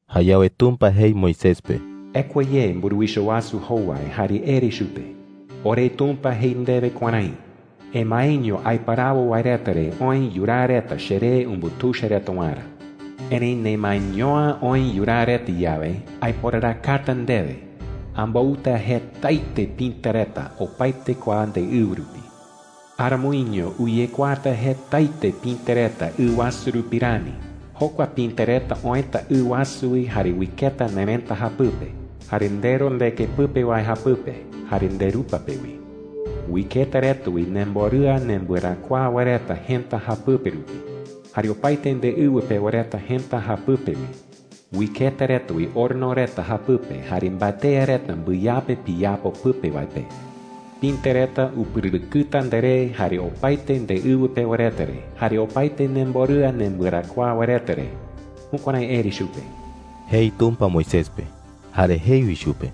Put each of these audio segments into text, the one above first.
Jayawe Tumpa jei Moisés pe: “Ekua ye mburuwicha wasu jowai jare ere chupe: ‘OreTumpa jei ndewe kuärái: ‘Emaeño aiparawo wae reta re oë yuraa reta cheree umbutuicha reta waerä. Erëi nemaeño’ä oë yuraa reta yawe, aiporarakata ndewe. Ambouta jetaete pïte reta opaete kua ndeɨwɨ rupi. Aramoiño uyekuaata jetaete pïte reta ɨ wasu rupi rani. Jokua pïte reta oëta ɨ wasu wi jare uiketa nerëta japɨpe, jare ndero ndeke pɨpe wae japɨpe, jare nderupa pe wi. Uiketa reta wi nemborɨa nembɨarakuaa wae reta jëta japɨpe rupi, jare opaete ndeɨwɨ pewa reta jëta japɨpe wi. Uiketa reta wi horno reta japɨpe jare mbatea reta mbɨyape piyapo pɨpe wae pe. Pïte reta upɨrɨrɨkɨta nderé, jare opaete ndeɨwɨ pewa reta re, jare opaete nemborɨa nembɨarakuaa wae reta re.’ Jukuärái ere chupe,” jei Tumpa Moisés pe. Jare jei wi chupe: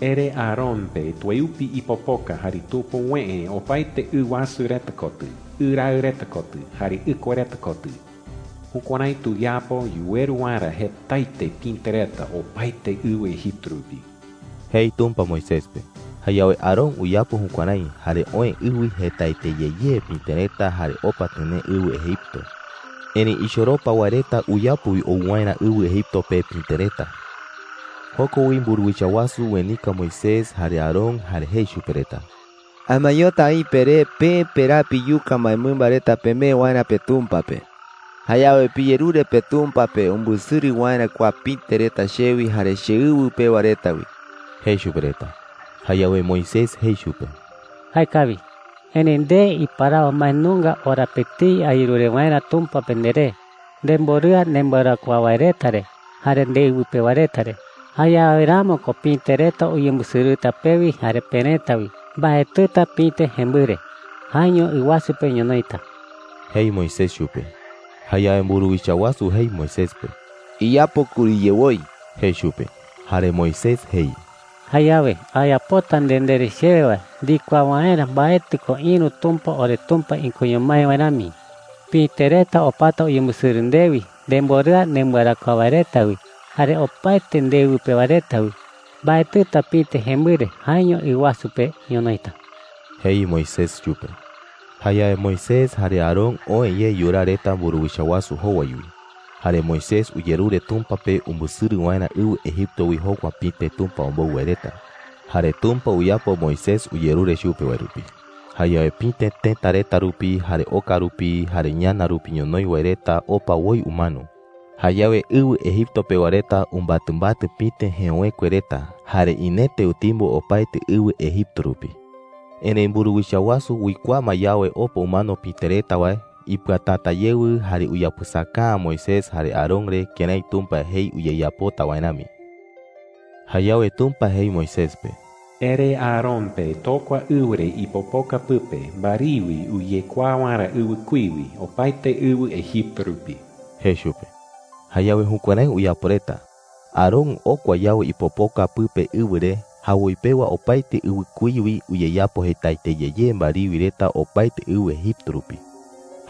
“Ere Aarón pe tueupi ipopoka jare tupuwëe opaete ɨ wasu reta kotɨ, ɨ raɨ reta kotɨ, jare ɨkua reta kotɨ. Jukuärái tuyapo yuweru waerä jetaete pïte reta opaete ɨwɨ Egipto rupi,” jei Tumpa Moisés pe. Jayawe Aarón uyapo jukuärái, jare oë ɨ wi jetaete ye ye pïte reta jare opa tɨnee ɨwɨ Egipto. Erëi ichoropa wae reta uyapo wi ou waerä ɨwɨ Egipto pe pïte reta. Joko wi mburuwicha wasu uenika Moisés jare Aarón jare jei chupe reta: “Amaeñota aï peré peë peraa piyuka mbaemɨmba reta pemee waerä peTumpa pe,” jei. “Jayawe piyerure peTumpa pe umbɨsɨrɨ waerä kua pïte reta chewi jare cheɨwɨ pewa reta wi,” jei chupe reta. Jayawe Moisés jei chupe: “Jaekawi, erëi nde iparawo mbae nunga ora pe etei ayerure waerä Tumpa pe nderé, nemborɨa nembɨarakuaa wae reta re, jare ndeɨwɨ pewa reta re. Jayawe ramo ko pïte reta uyembɨsɨrɨta pewi jare perëta wi. Mbaetɨta pïte jembɨre; jaeño ɨ wasu pe ñonoïta,” jei Moisés chupe. Jayawe mburuwicha wasu jei Moisés pe: “Iyapo kuriye woi,” jei chupe. Jare Moisés jei: “Jayawe ayapota nde ndere chewe wae ndikuaa waerä mbaetɨ ko ïru tumpa oreTumpa ikoño mái wae rami. Pïte reta opata uyembɨsɨrɨ ndewi, nemborɨa nembɨarakuaa wae reta wi, jare opaete ndeɨwɨ pewa reta wi. Mbaetɨta pïte jembɨre; jaeño ɨ wasu pe ñonoïta,” jei Moisés chupe. Jayawe Moisés jare Aarón oë ye yuraa reta mburuwicha wasu jowai wi. Jare Moisés uyerure Tumpa pe umbɨsɨrɨ waerä ɨwɨ Egipto wi jokua pïte Tumpa ombou wae reta. Jare Tumpa uyapo Moisés uyerure chupe wae rupi. Jayawe pïte tëta reta rupi, jare oka rupi, jare ñana rupi ñonoï wae reta opa woi umano. Jayawe ɨwɨ Egipto pewa reta umbatɨmbatɨ pïte jeöwekue reta. Jare inete utimbo opaete ɨwɨ Egipto rupi. Erëi mburuwicha wasu uikuaa ma yawe opa umano pïte reta wae, ipɨatäta yewɨ jare uyapɨsaka’ä Moisés jare Aarón re kërái Tumpa jei uyeyapota wae rami. Jayawe Tumpa jei Moisés pe: “Ere Aarón pe tokua ɨwɨ re ipopoka pɨpe mbariwi uyekuaa waerä ɨwɨkuí wi opaete ɨwɨ Egipto rupi,” jei chupe. Jayawe jukuärái uyapo reta. Aarón okua yawe ipopoka pɨpe ɨwɨ re, jawoi pewa opaete ɨwɨkuí wi uyeyapo jetaete ye ye mbariwi reta opaete ɨwɨ Egipto rupi.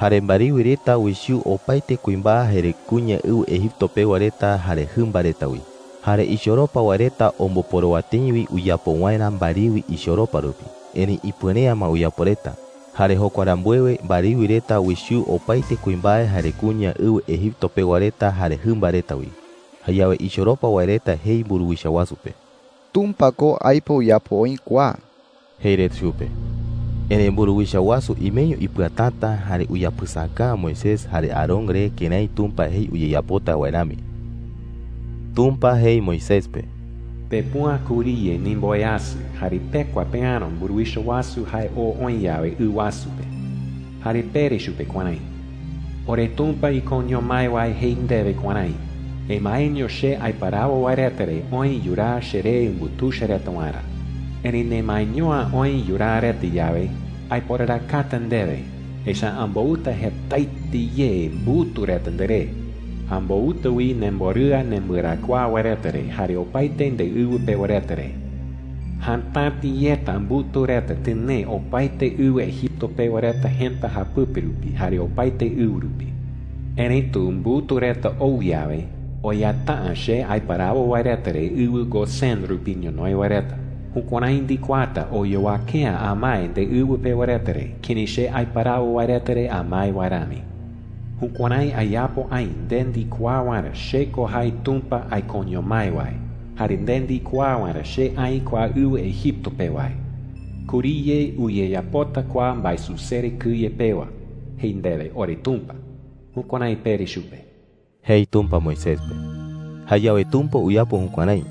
Jare mbariwi reta uichuu opaete kuimbae jare kuña ɨwɨ Egipto pewa reta jare jɨmba reta wi. Jare ichoropa wae reta omboporowa tëi wi uyapo waerä mbariwi ichoropa rupi, erëi ipuere’ä ma uyapo reta. Jare jokua rambuewe, mbariwi reta uichuu opaete kuimbae jare kuña ɨwɨ Egipto pewa reta jare jɨmba reta wi. Jayawe ichoropa wae reta jei mburuwicha wasu pe: “Tumpa ko aipo uyapo oï kua,” jei reta chupe. Erëi mburuwicha wasu imeño ipɨatäta jare uyapɨsaka’ä Moisés jare Aarón re kërái Tumpa jei uyeyapota wae rami. Tumpa jei Moisés pe: “Pepüa kuriye ndimboweasɨ, jare pekua peäro mburuwicha wasu jae oo oï yawe ɨ wasu pe. Jare pere chupe kuärái: ‘OreTumpa ikoño mái wae jei ndewe kuärái: ‘Emaeño che aiparawo wae reta re oë yuraa cheree umbutuicha reta waerä. Erëi nemaeño’ä oë yuraa reta yawe, aiporarakata ndewe, echa’ä ambouta jetaete ye mbutu reta nderé. Ambouta wi nemborɨa nembɨarakuaa wae reta re, jare opaete ndeɨwɨ pewa reta re. Jatäti yeta mbutu reta tɨnee opaete ɨwɨ Egipto pewa reta jëta japɨpe rupi, jare opaete ɨwɨ rupi. Erëitu mbutu reta ou yawe, oyata’ä che aiparawo wae reta re ɨwɨ Gosén Ɨwɨ Gosén oï wi ɨwɨ Egipto japɨpe. rupi ñonoï wae reta. Jukuärái ndikuaata oyowake’ä amae ndeɨwɨ pewa reta re kërái che aiparawo wae reta re amae wae rami. Jukuärái ayapo aï nde ndikuaa waerä che ko jae Tumpa aikoño mái wae jare nde ndikuaa waerä che aï kua ɨwɨ Egipto pe wae. Kuriye uyeyapota kua mbaesusere kɨye pewa,’ jei ndewe oreTumpa.’ Jukuärái pere chupe,” jei Tumpa Moisés pe. Jayawe Tumpa uyapo jukuärái.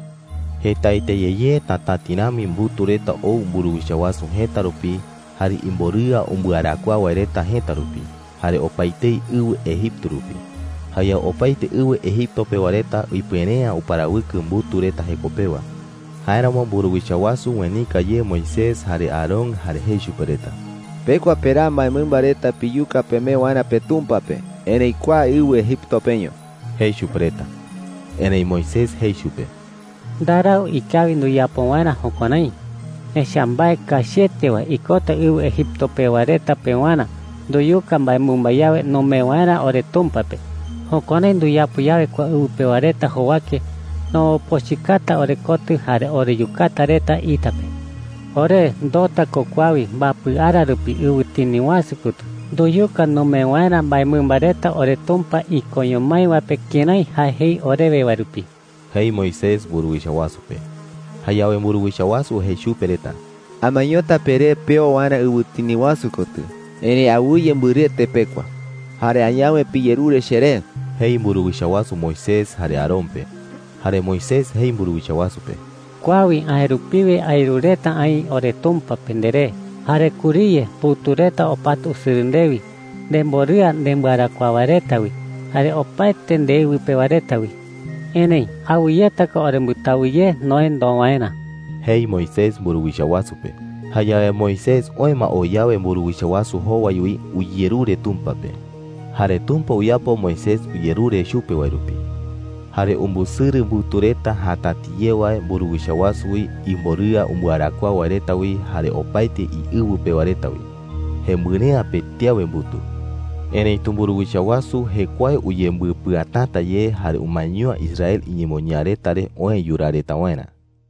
Jetaete ye ye tatäti rami mbutu reta ou mburuwicha wasu jëta rupi, jare imborɨa umbɨarakuaa wae reta jëta rupi, jare opaetei ɨwɨ Egipto rupi. Jayawe opaete ɨwɨ Egipto pewa reta ipuere’ä uparawɨkɨ mbutu reta jeko pewa. Jáeramo mburuwicha wasu uenika ye Moisés jare Aarón jare jei chupe reta: “Pekua peraa mbaemɨmba reta piyuka pemee waerä peTumpa pe, erëi kua ɨwɨ Egipto peño,” jei chupe reta. Erëi Moisés jei chupe: “Ndarau ikawi nduyapo waerä jukuärái,” jei. “Echa’ä mbae kachiete wae ikota ɨwɨ Egipto pewa reta pewarä nduyuka mbaemɨmba yawe numee waerä oreTumpa pe. Jukuärái nduyapo yawe kua ɨwɨ pewa reta jowake, nombopochɨkata orekotɨ jare oreyukata reta ita pe,” jei. “Ore ndoota ko kua wi mbapɨ ara rupi ɨwɨtini wasu kotɨ nduyuka numee waerä mbaemɨmba reta oreTumpa ikoño mái wae pe kërái jae jei orewe wae rupi,” jei Moisés mburuwicha wasu pe. Jayawe mburuwicha wasu jei chupe reta: “Amaeñota peré peo waerä ɨwɨtini wasu kotɨ, erëi awɨye mbɨrɨete pekua,” jei. “Jare añawe piyerure cheré,” jei mburuwicha wasu Moisés jare Aarón pe. Jare Moisés jei mburuwicha wasu pe: “Kua wi aë rupiwe ayerureta aï oreTumpa pe nderé. Jare kuriye mbutu reta opata usɨrɨ ndewi, nemborɨa nembɨarakuaa wae reta wi, jare opaete ndeɨwɨ pewa reta wi,” jei. “Erëi awɨyeta ko orembɨtawɨ ye noë ndoo waerä,” jei Moisés mburuwicha wasu pe. Jayawe Moisés oë ma oo yawe mburuwicha wasu jowai wi, uyerure Tumpa pe. Jare Tumpa uyapo Moisés uyerure chupe wae rupi, jare umbɨsɨrɨ mbutu reta jatäti ye wae mburuwicha wasu wi, imborɨa umbɨarakuaa wae reta wi, jare opaete iɨwɨ pewa reta wi. Jembɨre’ä pëti awe mbutu. Erëitu mburuwicha wasu jekuae uyembɨpɨatäta ye jare umaeño’ä Israel iñemoñaa reta re oë yuraa reta waerä.